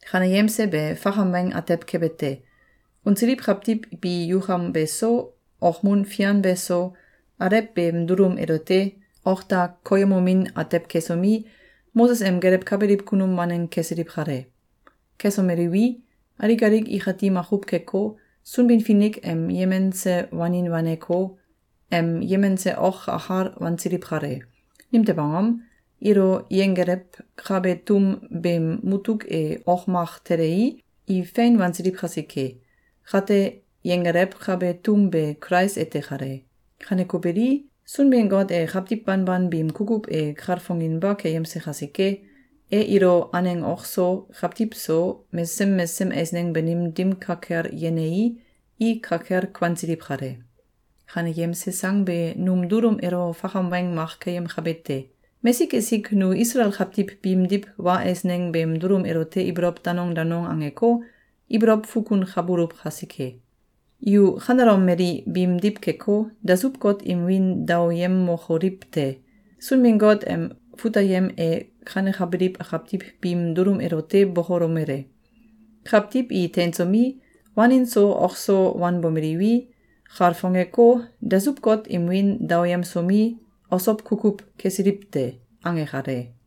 Kaneyemse be fakam weng atew kebe te. Unsiliw kawtiw bi yukam beso, okmun fian beso, alew beem dulum elote ok da koyemomin atew kesomi, Moses em gelewkabiliw kunum waneng kesiliw kale. Kesomeliwi, alik alik ikati makuw keko, Sunbin-Finik em yemense wanin waneko, em yemense ok akal wansiliw kale. Nimtew angom? Ilo yenggelewkabe tum beem mutuk e ok mak telei, i fein wansiliw kasike. Kate, yenggelewkabe tum be Kulais ete kale. Kaneko beli, Sunbin-Got e kawtiw banban biim kukuw e kalfonginba keyemse kasike, e ilo aneng ok so, kawtiw so, mesesem mesesem eisneng banim dim ka kel yenei, i ka kel kuansiliw kale. Kaneyemse sang be num dulum elo fakam weng mak keyemkabe te. Mesik esik nu Isalael kawtiw biimdiw wa eisneng beem dulum elote ibolow danong danong angeko, ibolow fukunkabuluw kasike. Yu kanelom mali biimdiw keko, dasuw-got im wiin daoyemokoliw te! Sunbin-Got em fut ayem e kanekabiliw kawtiw biim dulum elote bokolomele: “Kawtiw i teinsomi, wanin so ok so wanbomeliwi, kalfongeko, dasuw-got im wiin daoyemsomi, osow kukuw kesiliw te.”, ange kale.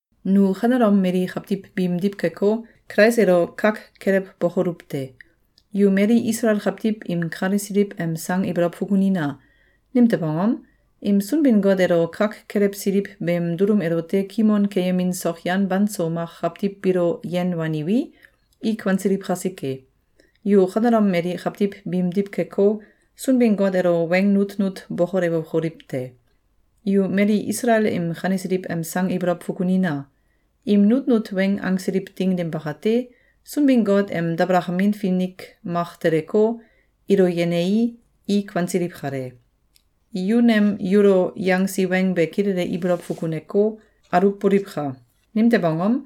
Nu kanelom mali kawtiw biimdiw keko, Kulais elo kak kelewbokoluw te! Yu mali Isalael kawtiw im kanesiliw em sang ibolow fukunina! Nimtew angom? Im Sunbin-Got elo kak kelewsiliw beem dulum elote kimon keyemin sokyan banso mak kawtiw biilo yen waniwi, i kuansiliw kasike. Yu kanelom mali kawtiw biimdiw keko, Sunbin-Got elo weng nutnut bokolewokoliw te! Yu mali Isalael im kanesiliw em sang ibolow fukunina! Im nutnut weng angsiliw ding dim bakate, Sunbin-Got em dabalakamin finik mak teleko, ilo yenei, i kuansiliw kale. Yu nem yulo yangsi weng be kilele ibolow fukuneko, aluwboliwka! Nimtew angom?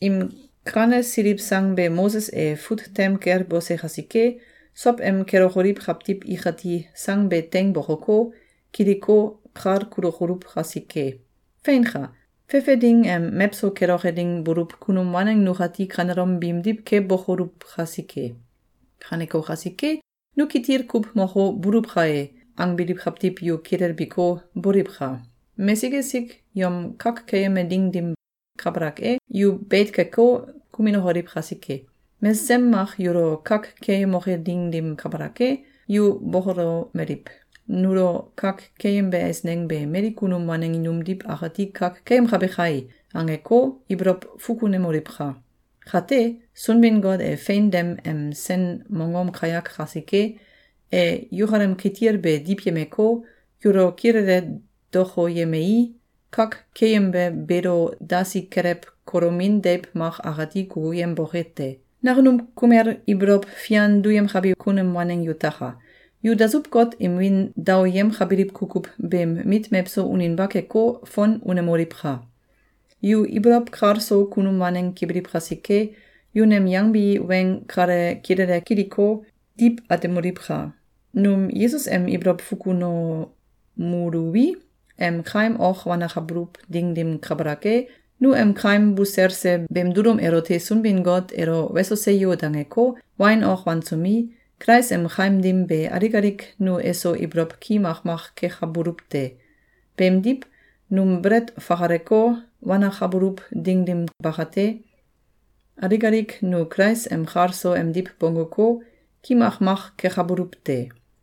Im kanesiliw sang be Moses e fut tem kel bose kasike, sow em kelokoliw kawtiw ikati sang be teing bokoko, kiliko, kal kulokoluw kasike. Feinka! Fefe ding em mewso keloke ding buluw kunum waneng nukati kanelom biimdiw kebokoluw kasike. Kaneko kasike, “Nu kitil kuw moko, buluw kae!”, angbiliw kawtiw yu kilelbiko, boliwka! Mesik esik yom kak keyeme ding dim kabalak e, yu beit keko, kuminokoliw kasike! Mesesem mak yulo kak keeyemoke ding dim kabalak e, yu bokolomeliw: “Nulo kak keyembe eisneng be mali kunum waneng numdiw akati kak keyemkabe kai!”, angeko, ibolow fukunemoliwka! Kate, Sunbin-Got e fein dem em sen mongom kayak kasike, e yukalem kitil be diwyemeko, yulo kilele dokoyemei, kak keeyembe beelo dasi kelew kolomin deiw mak akati kukuyemboke te. Nakunum kumel ibolow fian duyemkabi kunum waneng yutaka! Yu dasuw-got im wiin daoyemkabiliw kukuw beem mit mewso uninba keko, fon unemoliwka! Yu ibolow kal so kunum waneng kebiliw kasike, yu nem yangbi weng kale kilele kiliko, diw atemoliwka! Num Yesus em ibolow fukunomuluwi, em kaim ok wanakabuluw ding dim kabalak e, nu em kaim buselse beem dulum elote Sunbin-Got elo “Weso! Seyo!”, dangeko, wain ok wansomi, Kulais em kaim dim be alik alik nu eso ibolow ki makmak kekabuluw te. Beemdiw, num belet fakaleko, wanakabuluw ding dim bakate, alik alik nu Kulais em kal so emdiw bongguko, ki makmak kekabuluw te.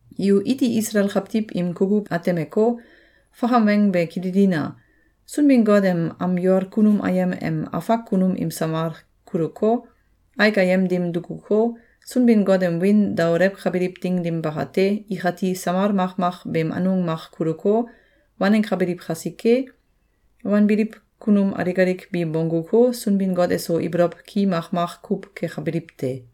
Yu iti Isalael kawtiw im kukuw atemeko, fakam weng be kililina! Sunbin-Got em am yol kunum ayem em afak kunum im samal kuluko, aik ayem dim dukuko, Sunbin-Got em wiin daolewkabiliw ding dim bakate, ikati samal makmak beem anung mak kuluko, wanenkabiliw kasike, wanbiliw kunum alik alik bi bongguko, Sunbin-Got eso ibolow ki makmak kuw kekabiliw te.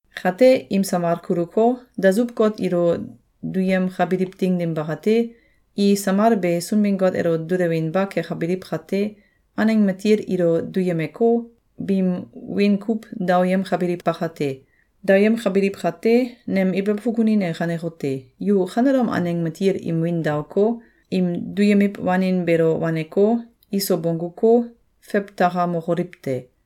Kate, im samal kuluko, dasuw-got ilo duyemkabiliw ding dim bakate, i samal be Sunbin-Got elo dulewinba kekabiliw kate, aneng matil ilo duyemeko, biim wiin kuw daoyemkabiliw bakate. Daoyemkabiliw kate, nem ibolow fukunin e kanekote: Yu kanelom aneng matil im win daoko, im duyemiw wanin beelo waneko, iso bongguko, fewtakamokoliw te!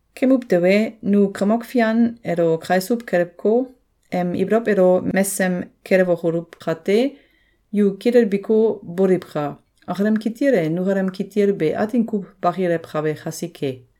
Kemuw tewe, nu Kamok Fian elo kaisuw kelewko, em ibolow elo mesem kelewokoluw kate, yu kilelbiko, boliwka! Akalem kitil e nukalem kitil be atin kuw bakilewkabe kasike!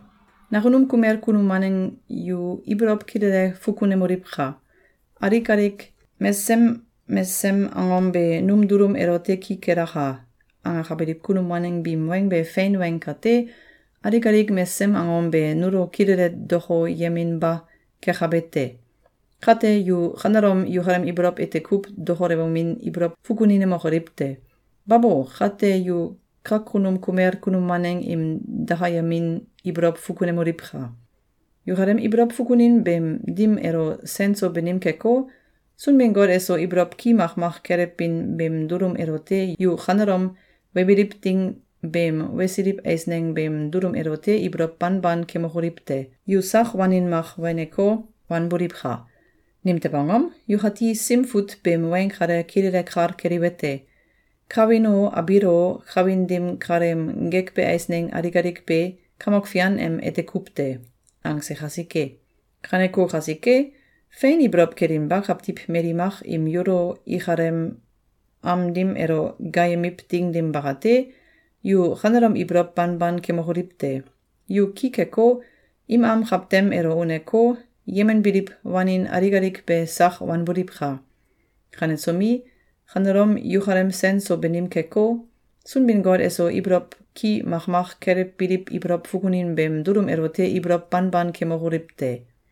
Nakunum kumel kunum waneng yu ibolow kilele fukunemoliwka! “Alik alik mesesem mesesem angom be num dulum elote ki kelaka!”, angakabiliw kunum waneng biim weng be fein weng kate, alik alik mesesem angom be nulo kilele dokoyeminba kekabe te. Kate, yu kanelom yukalem ibolow ete kuw dokolewomin ibolow fukuninemokoliw te! Babo! Kate yu kakunum kumel kunum waneng im dakayemin ibolow fukunemoliwka! Yukalem ibolow fukunin beem dim elo sen so banim keko, Sunbin-Got eso ibolow ki makmak kelewbin beem dulum elote yu kanelom webiliw ding beem wesiliw eisneng beem dulum elote ibolow banban kemokoliw te! Yu sak wanin mak weneko, wanboliwka! Nimtew angom? Yukati Sim Fut beem weng kale kilele kal keliwete: “Kawin o, abiil o, kawin dim kaleem gekbe eisneng alik alik be, Kamok Fian em ete kuw te.”, angse kasike. Kaneko kasike, fein ibolow kelinba kawtiw mali mak im yulo ikalem am dim elo gaayemiw ding dim bakate, yu kanelom ibolow banban kemokoliw te! Yu ki keko, im am kawtem elo uneko, yemenbiliw wanin alik alik be sak wanboliwka! Kanesomi, kanelom yukalem sen so banim keko, Sunbin-Got eso ibolow ki makmak kelewbiliw ibolow fukunin beem dulum elote ibolow banban kemokoliw te!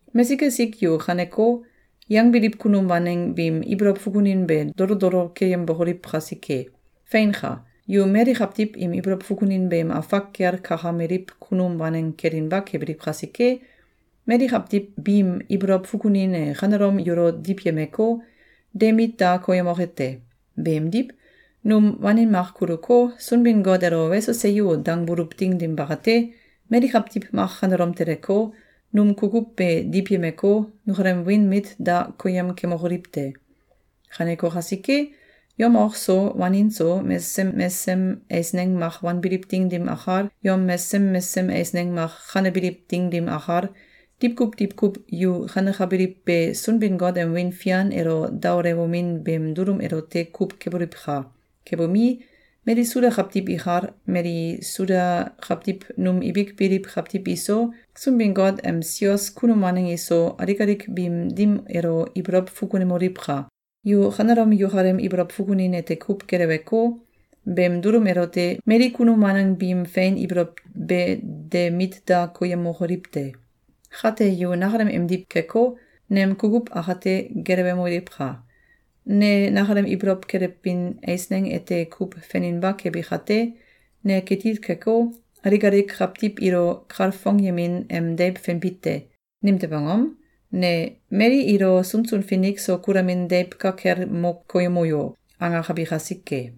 Mesik esik yu kaneko yangbiliw kunum waneng biim ibolow fukunin be dolo dolo keyembokoliw kasike. Feinka! Yu mali kawtiw im ibolow fukunin beem afak kel kakameliw kunum waneng kelinba kebiliw kasike, mali kawtiw biim ibolow fukunin e kanelom yulo diwyemeko, de mit da koyemoke te! Beemdiw, num wanin mak kuluko, Sunbin-Got elo “Weso! Seyo!”, dangbuluw ding dim bakate, mali kawtiw mak kanelom teleko, num kukuw be diwyemeko, nukalem wiin mit da koyem kemokoliw te! Kaneko kasike, yom ok so, wanin so, mesesem mesesem eisneng mak wanbiliw ding dim akal, yom mesesem mesesem eisneng mak kanebiliw ding dim akal, diwkuw diwkuw yu kanekabiliw be Sunbin-Got em wiin fian elo daolewomin beem dulum elote kuw keboliwka! Kebomi, mali Suda kawtiw ikal, mali Suda kawtiw num ibik biliw kawtiw iso, Sunbin-Got em sios kunum waneng iso, alik alik biim dim elo ibolow fukunemoliwka! Yu kanelom yukalem ibolow fukunin ete kuw geleweko, beem dulum elote mali kunum waneng biim fein ibolow be de mit da koyemokoliw te! Kate, yu nakalem emdiw keko, nem kukuw akate gelewemoliwka! Ne nakalem ibolow kelewbin eisneng ete kuw feninba kebi kate, ne kitil keko, alik alik kawtiw ilo kalfongyemin em deiw fenbi te. Nimtew angom? Ne “Mali ilo sunsun finik so kulamin deiw ka kel mo koyemo yo!”, angakabi kasike.